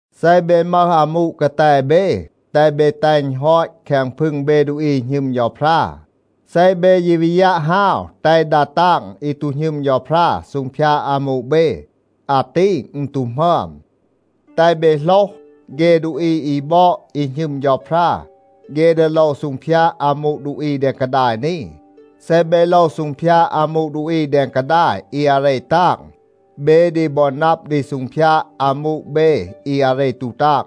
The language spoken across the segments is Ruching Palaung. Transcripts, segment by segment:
เซ เบ มึห อามู กาแต เบ, แตห เบ แตห อึณ ฮอต แคง พึง เบ ดูอี อี หณึม เฌาพรา. เซ เบ ยี วี ยัะ ฮาว แตห ดา ตาง อี ตู หณึม เฌาพรา ซูงพยาด อามู เบ, อาตี อึณ ตู หมึอม. แตห เบ โหลห, เฆ ดูอี อี บอด, อี หณึม เฌาพรา, เฆ ดี โลว ซูงพยาด อามู ดูอี แดง กาดาย นี. เซ เบ โลว ซูงพยาด อามู ดูอี แดง กาดาย อี อาเร ตาง, เบ ดี บอ นับ ดี ซูงพยาด อามู เบ อี อาเร ตู ตาง.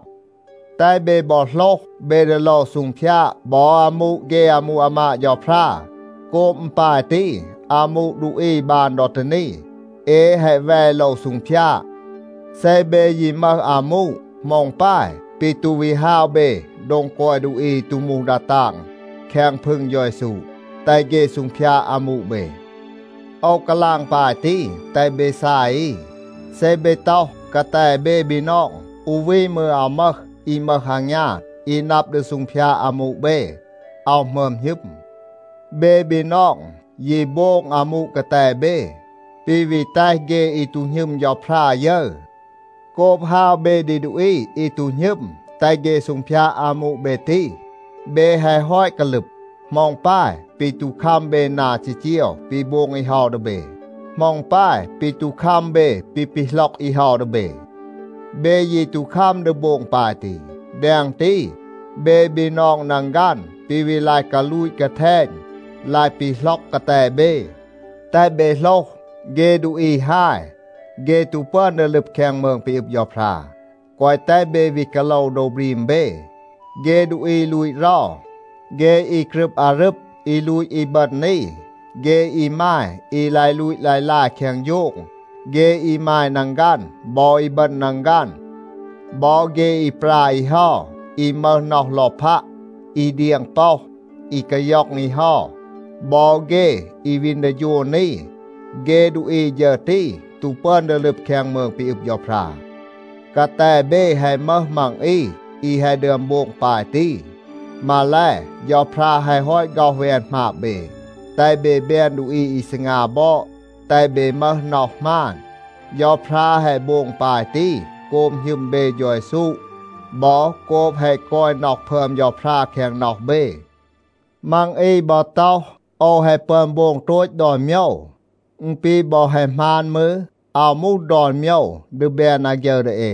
แตห เบ บอ โหลห, เบ ดี โลว ซูงพยาด บอ อามู เฆ อามู อามาด เฌาพรา. โกบ อึณ ปาย ตี, อามู ดูอี บาน ดอ ตี นี, เอ แฮะ แว โลว ซูงพยาด. เซ เบ ยี มึห อามู, เหมา อึณ ปาย ปี ตู วี ฮาว เบ โดง กอย ดูอี อี ตู มูห ดา ตาง แคง พึง เฌา เยซู, แตห เฆ ซูงพยาด อามู เบ? โอว กาลาง ปาย ตี, แตห เบ ซาย อี. เซ เบ ต็อห, กาแต เบ บีนอง, อู วี มืร อาว มึห อี มึห อางยาน, อี นับ ดี ซูงพยาด อามู เบ, อาว หมึอม หณึม. เบ บีนอง ยี โบง อามู กาแต เบ, ปี วี แตห เฆ อี ตู หณึม เฌาพรา ยึร. โกบ ฮาว เบ ดี ดูอี อี ตู หณึม, แตห เฆ ซูงพยาด อามู เบ ตี, เบ แฮะ ฮอต กาลึบ. เหมา อึณ ปาย ปี ตู คัม เบ นา จีจีว ปี โบง อี เฮา ดี เบ? เหมา อึณ ปาย ปี ตู คัม เบ ปี ปีหล็อก อี เฮา ดี เบ? เบ ยี ตู คัม ดี โบง ปาย ตี. แดง ตี, เบ บีนอง นังฆัน ปี วี ลาย กาลูต กาแทณ, ลาย ปีหล็อก กาแต เบ. แตห เบ โหลห, เฆ ดูอี ฮาย, เฆ ตู ปึอน ดี ลึบ แคง มืง ปี อึบ เฌาพรา. แกวะ แตห เบ วี กาโลว โดว บรีม เบ. เฆ ดูอี ลูต เรา, เฆ อี กรึบ อารึบ, อี ลูต อีบึณ อี, เฆ อีมาย อี ลาย ลูต ลาย ลาย แคง โฌง, เฆ อีมาย นังฆัน บอ อีบึณ นังฆัน, บอ เฆ อี ปรา อี เฮา, อี มึห น็อห ลอพัะ, อี เดียง ป็อห, อี กาย็อง อี เฮา, บอ เฆ อี วีน ดี โฌน อี, เฆ ดูอี ฌึร ตี ตู ปึอน ดี ลึบ แคง มืง ปี อึบ เฌาพรา. กาแต เบ แฮะ มึห มัง อี อี แฮะ ดึอม โบง ปาย ตี. มาแล, เฌาพรา แฮะ ฮอต ฆ็อห แวน หมาบ เบ, แตห เบ แบน ดูอี อี ซีงา บอด, แตห เบ มึห น็อห หมาน. เฌาพรา แฮะ โบง ปาย ตี, โกบ หณึม เบ เฌา เยซู บอ โกบ แฮะ กอย น็อห พึอม เฌาพรา แคง น็อห เบ. มัง อี บอ ต็อห, “โอว แฮะ ปึอน โบง โตต ดอน โมยว.” อึณ ปี บอ แฮะ หมาน มืร, อาว มูห ดอน โมยว ดี แบน อาฆยึร ดี เอ.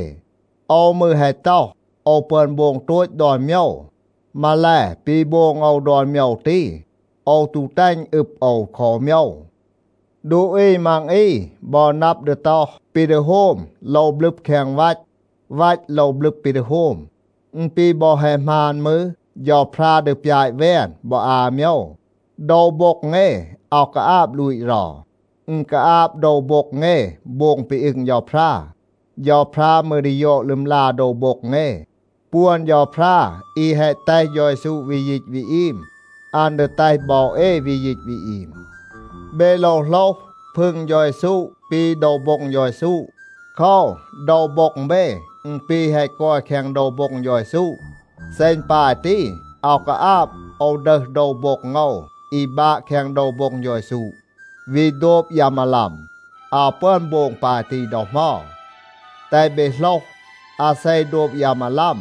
โอว มืร แฮะ ต็อห, “โอว ปึอน โบง โตต ดอน โมยว.” มาแล, ปี โบง โอว ดอน โมยว ตี, โอว ตู แตห อึณ อึบ โอว คอ อู โมยว. ดูอี มัง อี บอ นับ ดี ต็อห, “ปี ดี โฮม โลว บลึบ แคง วัต. วัต โลว บลึบ ปี ดี โฮม.” อึณ ปี บอ แฮะ หมาน มืร, เฌาพรา ดี ปยาต แวน บอ อา โมยว. โดว โบ็ง เอ อาว กาอาบ ลูต เรา. อึณ กาอาบ โดว โบ็ง เอ โบง ปี อึง เฌาพรา. เฌาพรา มืร ดี ยอด ลึมลา โดว โบ็ง เอ. ปวน เฌาพรา อี แฮะ แตห เฌา เยซู วี ยีต วี อีม, อัน ดี แตห บอ เอ วี ยีต วี อีม. เบ โลว โหลห, พึง เฌา เยซู ปี โดว โบ็ง เฌา เยซู. โคว, โดว โบ็ง เบ, อึณ ปี แฮะ กอย แคง โดว โบ็ง เฌา เยซู. เซ อึณ ปาย ตี, อาว กาอาบ โอว ดึห โดว โบ็ง โอว อี บาะ แคง โดว โบ็ง เฌา เยซู, วี โดบ ยา มาลัม. อาว ปึอน โบง ปาย ตี ดอ เหมา. แตห เบ โหลห, อาเซ โดบ ยา มาลัม,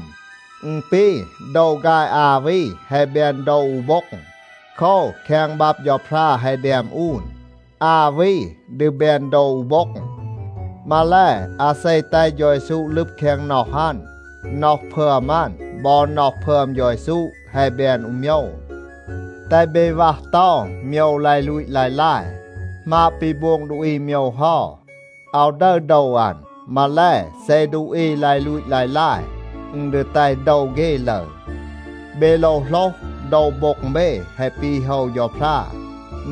อึณ ปี โดว ฆาย อา วี แฮะ แบน โดว อู โบ็ง. โคว, แคง บับ เฌาพรา แฮะ แดม อูน, “อา วี ดี แบน โดว อู โบ็ง.” มาแล, อาเซ แตห เฌา เยซู ลึบ แคง น็อห อัน, น็อห พึอม อัน บอ น็อห พึอม เฌา เยซู แฮะ แบน อู โมยว. แตห เบ วัห เตา โมยว ลาย ลูต ลาย ลาย. หมาบ ปี โบง ดูอี โมยว เฮา, อาว ดึร โดว อัน. มาแล, เซ ดูอี ลาย ลูต ลาย ลาย, อึณ ดี แตห โดว เฆ ลึร. เบ โลว โหลห, โดว โบ็ง เบ แฮะ ปี โฮว เฌาพรา.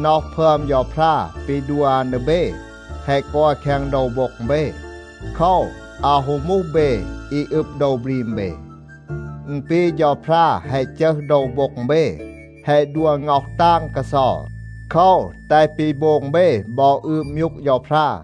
น็อห พึอม เฌาพรา ปี ดัว อัน ดี เบ แฮะ กอย แคง โดว โบ็ง เบ. โคว, อาว ฮู มูห เบ อี อึบ โดว บรีม เบ. อึณ ปี เฌาพรา แฮะ จึห โดว โบ็ง เบ, แฮะ ดัว ง็อห ตาง กาเซา. โคว, แตห ปี โบง เบ บอ อืบ มยูก เฌาพรา.